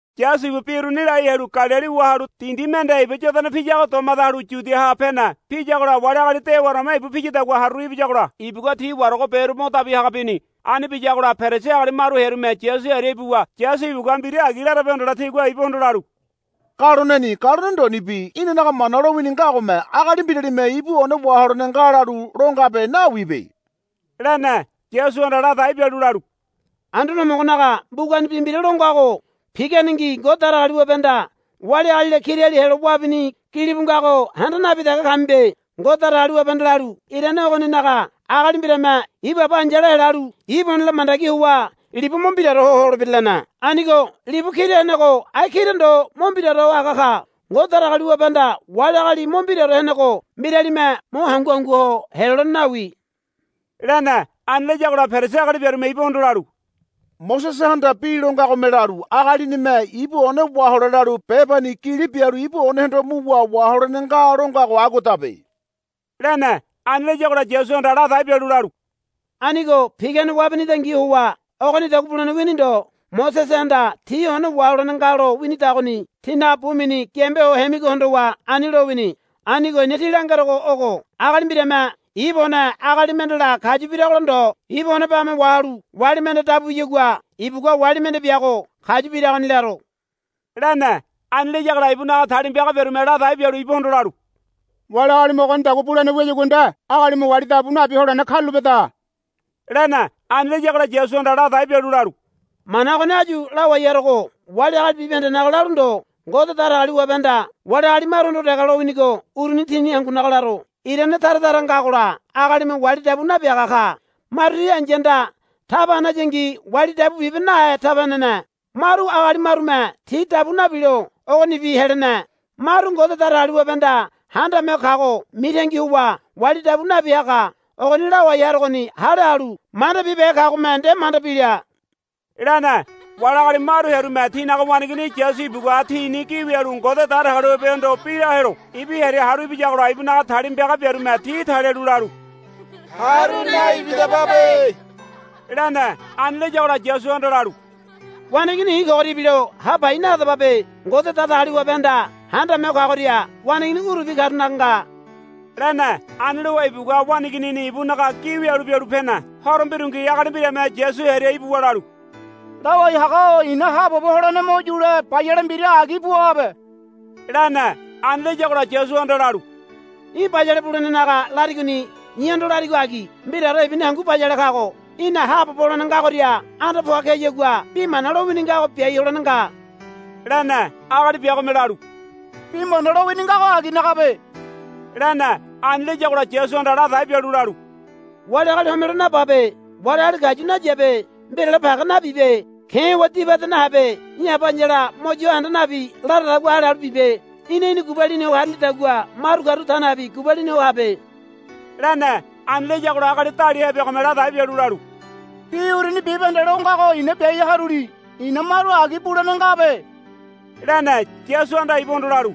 Yasu ibu bi uruni lai halu Galili wahalu dindi mende Iba Yodana piyago domade halu Yudiaha pene. Piyagola wali agali dewaoreme ibu piyadagua haruru ibiyagola ibugua ti waragoberu mo dabi haga bini. Ani biyagola Perisi agali maru hearume Yasu hearia ibuwa Yasu ibugua mbira agi larabe hondole tigua ibuhondo lalu, Galoneni galone ndonibi inanaga Mana lowini ngagome agali mbiralime ibu one waholene nga lalu lo ngabe nawibe, lene. Yasuhanda ladai bialu lalu, Anduane Homogonaga mbugani bi mbira lo ngago, Piganengi Ngode Datagaliwabehanda wali agalila kirali helo wabini, gilibu ngago handa nabi dege kamibe. Ngode Datagaliwabehanda lalu, Irane ogoninaga agali mbirame ibu aba ai̱yala helalu ibu onela mandagi howa libu mo mbiraore ho holebira, lene. Anigo libu kira henego ai kira ndo mo mbiraore ho haga ka. Ngode Datagaliwabehanda wali agali mo mbiraore henego mbiralime mo hangu hangu ho helolene nawi, lene. Ani layagola Perisi agali biarume ibuhondo lalu, Mosesehanda bi lo ngagome lalu, Agalinime ibu one wahole lalu bebani gili bialu ibu onehondo muwa waholene nga, lo ngago aguadabe, lene. Ani layagola Yasuhanda ladai bialu lalu. Anigo pigane wabinidangi howa ogonidagua bulene wini ndo. Mosesehanda tí one waholene nga lo winidagoni tínaga bu mini giambe ho hemigo hondowa ani lowini. Anigo i̱na tí langerogo ogo. Agali mbirame ibu one agali mendela kayu biragola ndo ibu one bame wahalu wali mende dabu biyagua ibugua wali mende biago kayu biragoni laro, lene. Ani layagola ibunaga talima piaga biarume ladai bialu ibuhondo lalu, Wali agalime ogonidagua bulene wiyagua nde agalime wali dabu nabi holene karulapeda, lene. Ani layagola Yasuhanda ladai bialu lalu, Mana ogoni áyu lawai harogo wali agali bibahendenaga lalu ndo Ngode Datagaliwabehanda wali agali maruhondo dege laminigo uruni tini hangunaga laro. Irane tara tara ngagola agalime wali dabu nabiaga ka. Maru ti ai̱yahanda taba hanayangi wali dabu bibe nahe taba henene. Maru agali marume ti dabu nabilo ogonibi helene. Maru Ngode Datagaliwabehanda Handame Ho Kago mitangi howa wali dabu nabi haga. Ogoni lawai harogoni hale halu manda bibehe kagome nde manda bila, lene. Wali agali maru hearume tinaga waneigini Yasu ibugua tini gi wialu Ngode Datagaliwabehondo bi la helo ibu hearia haru ibiyagola ibunaga talima piaga biarume ti talialu lalu, Haru naibidababe, lene. Ani layagola Yasuhanda lalu, Waneigini i̱ kogoria ibilo ha pai nahadababe. Ngode Datagaliwabehanda Handame Ho Kagoria waneigini urubi karunaga nga, lene. Ani lowa ibugua waneiginini ibunaga gi wialu bialu pene. Horo mbirungi agali mbirame Yasu hearia ibuwa lalu, Lawai haga-o i̱na haabobo holene mo yule bayale mbira agi buabe, lene. Ani layagola Yasuhanda lalu, Í̠ bayale bulenenaga larigoni i̱hondo larigo agi. Mbiraore ibuni hangu bayale kago. Í̠na haabobo holene ngagoria anda poa keyagua bi mana lowini ngago biai holene nga, lene. Agali biagome lalu. Bi mana lowini ngago aginagabe, lene. Ani layagola Yasuhanda ladai bialu lalu. Wali agali homelo nababe. Wali agali kayu nayabe. Mbirale page nabibe. Ke̱ howa dibade nahabe. Í̠ aba ai̱yala mo yo handa nabi laradagua hale halu bibe. Í̠na í̠ni gubalini ho harilidagua maru karu ta nabi gubalini ho habe, lene. Ani layagola agali daliahe biagome ladai bialu lalu, Bi uruni bibahende lo ngago i̱na biai haruli. I̱na maru agi bulene ngabe, lene. Yasuhanda ibuhondo lalu,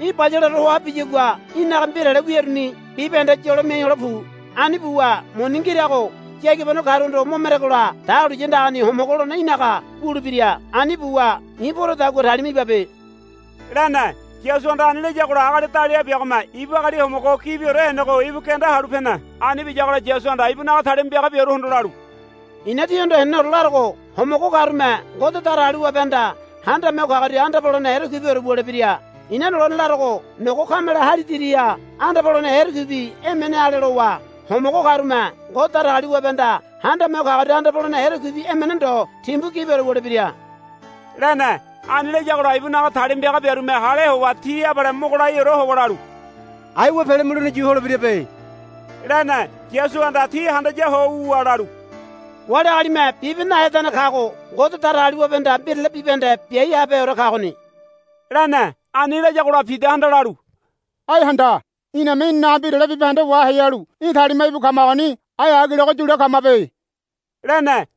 Í̠ bayaleore hoa biyagua í̠naga mbirale wiruni bibahende yolo miai hole pu. Ani buwa muni ngirago yagibano karuhondo mo meregola dahuliya andagani homogo holene í̠naga wulebira. Ani buwa i̱ porodagua talima ibabe, lene. Yasuhanda ani layagola agali daliahe biagome ibu agali homogo gibiore henego ibu genda halu pene. Ani biyagola Yasuhanda ibunaga talima piaga biaruhondo lalu, I̱na tíhondo heneneore larogo. Homogo karume Ngode Datagaliwabehanda Handame Ho Kagoria anda polene erekuibiore wulebira. I̱na lone larogo nogo kameleme hali diriha anda polene erekuibi emene ale lowa homogo karume Ngode Datagaliwabehanda Handame Ho Kagoria anda polene erekuibi emene ndo timbu gibiore wulebira, lene. Ani layagola ibunaga talima piaga biarume hale howa ti abale mogo laiore howa lalu, Aiwa pele mulene yu holebirabe, lene. Yasuhanda ti handaya ho wuwa lalu, Wali agalime bibe nahedane kago Ngode Datagaliwabehanda mbirale bibahende biai habeheore kagoni, lene. Ani layagola Pidahanda lalu, Ai handa. Iname inanaga mbirale bibahende wahai halu í̠ talima íbu kamagoni. Ai agilego yule kamabe, lene.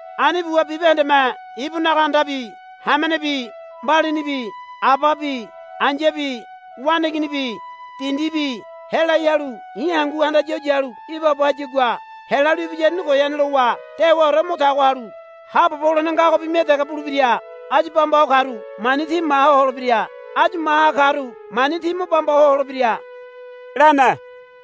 Ani buwa bibahendeme ibunaga andabi hamenebi mbalinibi ababi ai̱yabi waneiginibi dindibi helai halu i̱ hangu handaya ho yalu ibaabo hayagua helalu ibiyaruni goyane lowa dewaore mo yatago halu haabobo holene ngagobi mia dege bulebira. Áyu bamba ho karu mani ti maha holebira. Áyu maha karu mani ti mo bamba ho holebira, lene.